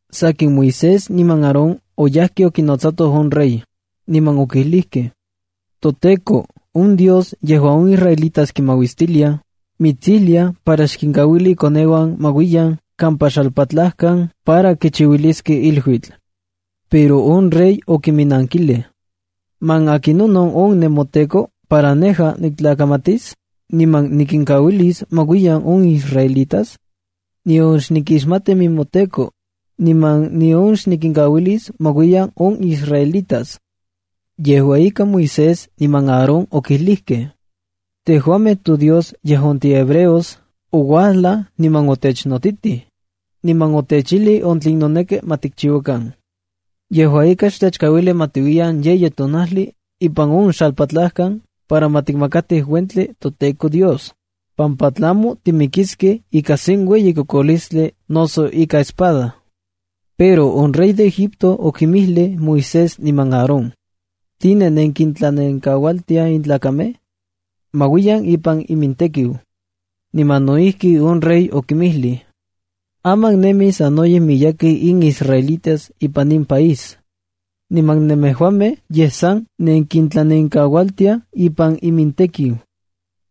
Sakin, Moisés niman Aarón oyajkej okinotsatoj on rey, niman okilijkej: —ToTEKO, on Dios yejuan on israelitas tikmauistiliaj, mitsijlia para xkinkauili ikoneuan ma uiyan kampa xalpatlajkan para ma kichiuiliskej iluitl. Pero on rey okinminnankilij: —¿Man akinon “on nemoTEKO” para nejua niktlakamatis, niman nikinkauilis ma uiyan on israelitas? Nion xnikixmati nemoTEKO, niman nion xnikinkauilis ma uiyan on israelitas. Yejua ika, Moisés niman Aarón okijlijkej: —ToDios tejuamej yejuan tihebreos, ouajlaj niman otechnotitij, niman otechijlij on tlen noneki ma tikchiuakan. Yejua ika, xtechkauili ma tiuiyan yeyi tonajli ipan on xalpatlajkan para ma tikmakatij uentli toTEKO Dios, pampa tlamo timikiskej ika sen ueyi kokolistli noso ika espada. Pero on rey de Egipto okinmijlij Moisés niman Aarón: —¿Tline nenkintlanenkaualtiaj in tlakamej? Ma uiyan ipan imintekiu. Niman no ijki on rey okinmijlij: —Aman nemij sanoyej miyekej in israelitas ipan in país, niman nemejuamej yej san nenkintlanenkaualtiaj ipan imintekiu. Ipan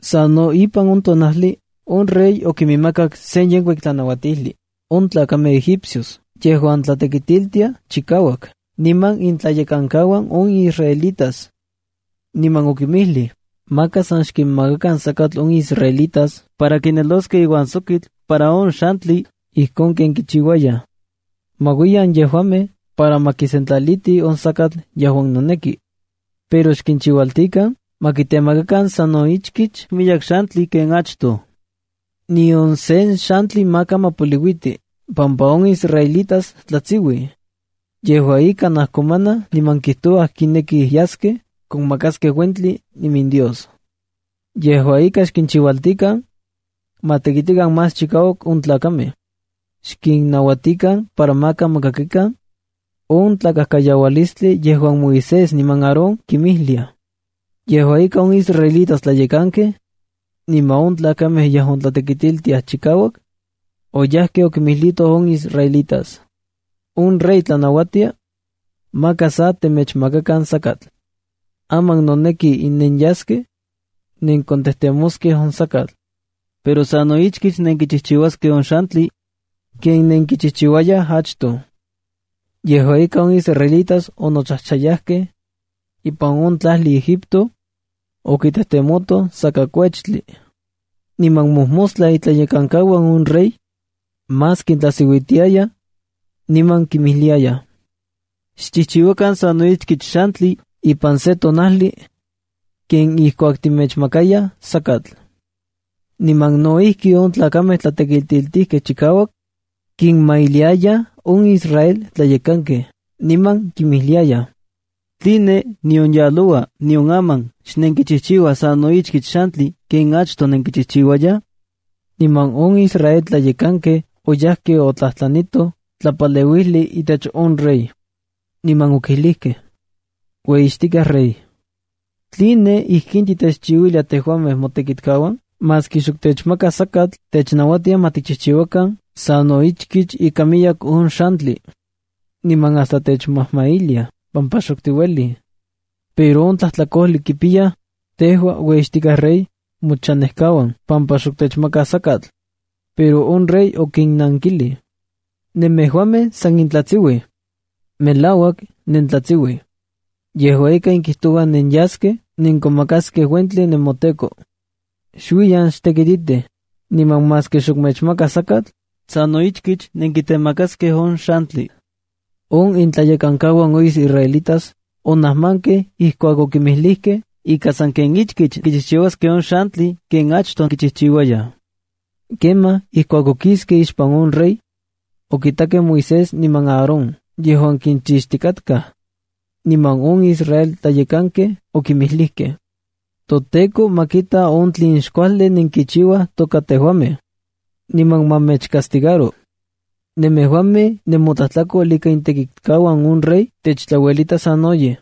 san no yejua on tonajli on rey okinmakak sen yenkuik tlanauatijli on tlakamej egipcios yejuan tlatekitiltiaj chikauak niman intlayekankauan on israelitas. Niman okinmijlij: —Maka sa xkinmakakan sakatl on israelitas para kinelosej iuan sokitl para on xantli ijkon ken kichiuayaj. Ma uiyan yejuamej para ma kisentlalitij on sakatl yejuan noneki. Pero xkinchiualtikan ma kitemakakan sa no ichkich miyek xantli ken achtoj. Nion sen xantli maka ma poliuiti pampa on israelitas tlatsiuij. Yejua ika, najkomanaj niman kijtouaj kinekij yaskej konmakaskej uentli iminDios. Yejua ika, xkinchiualtikan ma tekitikan más chikauak on tlakamej. Xkinnauatikan para maka ma kakikan on tlakajkayaualistli yejuan Moisés niman Aarón kinmijliaj. Yejua ika, on israelitas tlayekankej niman on tlakamej yejuan tlatekitiltiaj chikauak, oyajkej okimijlitoj on israelitas: —On rey tlanauatia maka sa temechmakakan sakatl. Aman noneki nenyaskej nenkontejtemoskej on sakatl. Pero sa no ichkich nenkichijchiuaskej on xantli ken nenkichijchiuayaj achtoj. Yejua ika, on israelitas onochajchayakej ipan on tlajli Egipto okitejtemotoj sakakuechtli. Niman mojmostla itlayekankauan on rey más kintlajsiuitiayaj, niman kinmijliayaj: —Xchijchiuakan sa no ichkich xantli ipan se tonajli ken ijkuak temechmakayaj sakatl. Niman no ijki on tlakamej tlatekitiltijkej chikauak kinmajmailiayaj on israel tlayekankej, niman kinmijliayaj: —¿Tline, nion yaloua, nion aman, xnenkichijchiuaj sa no ichkich xantli ken achtoj nenkichijchiuayaj? Niman on israel tlayekankej oyajkej otlajtlanitoj tlapaleuijli itech on rey, niman okilijkej: —Ueyixtikaj rey, ¿tline ijkin titechchiuilia tejuamej motekitkauan? Maski xok techmakaj sakatl, technauatiaj ma tikchijchiuakan sa no ichkich ika miyek on xantli. Niman hasta techmajmailiaj pampa xok tiuelij. Pero on tlajtlakojli kipiyaj, tejua ueyixtikaj rey, mochanejkauan pampa xok techmakaj sakatl. Pero on rey okinnankilij: —¡Nemejuamej san nentlatsiuij! ¡Melauak, nentlatsiuij! Yejua ika, nenkijtouaj nenyaskej nenkomakaskej uentli nemoTEKO. Xuiyan xtekititij, niman maski xok mechmakaj sakatl, sa no ichkich nenkitemakaskej on xantli. On intlayekankauan on israelitas onajmankej ijkuak okinmijlijkej ika sanken ichkich kichijchiuaskej on xantli ken achtoj kichijchiuayaj. Kemaj ijkuak okiskej ixpan on rey, okitakej Moisés niman Aarón yejuan kinchixtikatkaj. Niman on israel tlayekankej okinmijlijkej: —ToTEKO ma kita on tlen xkuajli nentechchiuaj toka tejuamej, niman ma mechcastigaro. Nemejuamej nemotlajtlakol ika itekitkauan on rey techtlauelitaj sanoyej.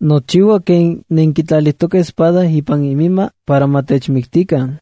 Nochiua ken nenkitlalijtokej espada ipan iminma para ma techmiktikan.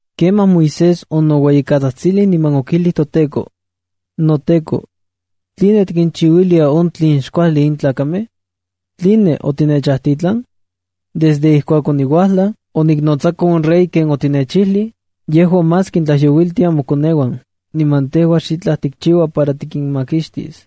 Kemaj Moisés onoueyikatsajtsilij niman okijlij toTEKO: —NoTEKO, ¿tline tikinchiuilia on tlen xkuajli in tlakamej? ¿Tline otinechajtitlan? Desde ijkuak oniuajlaj oniknotsako on rey ken otinechijlij, yejua más kintlajyouiltia mokoneuan, niman tejua xitlaj tikchiua para tikinmakixtis.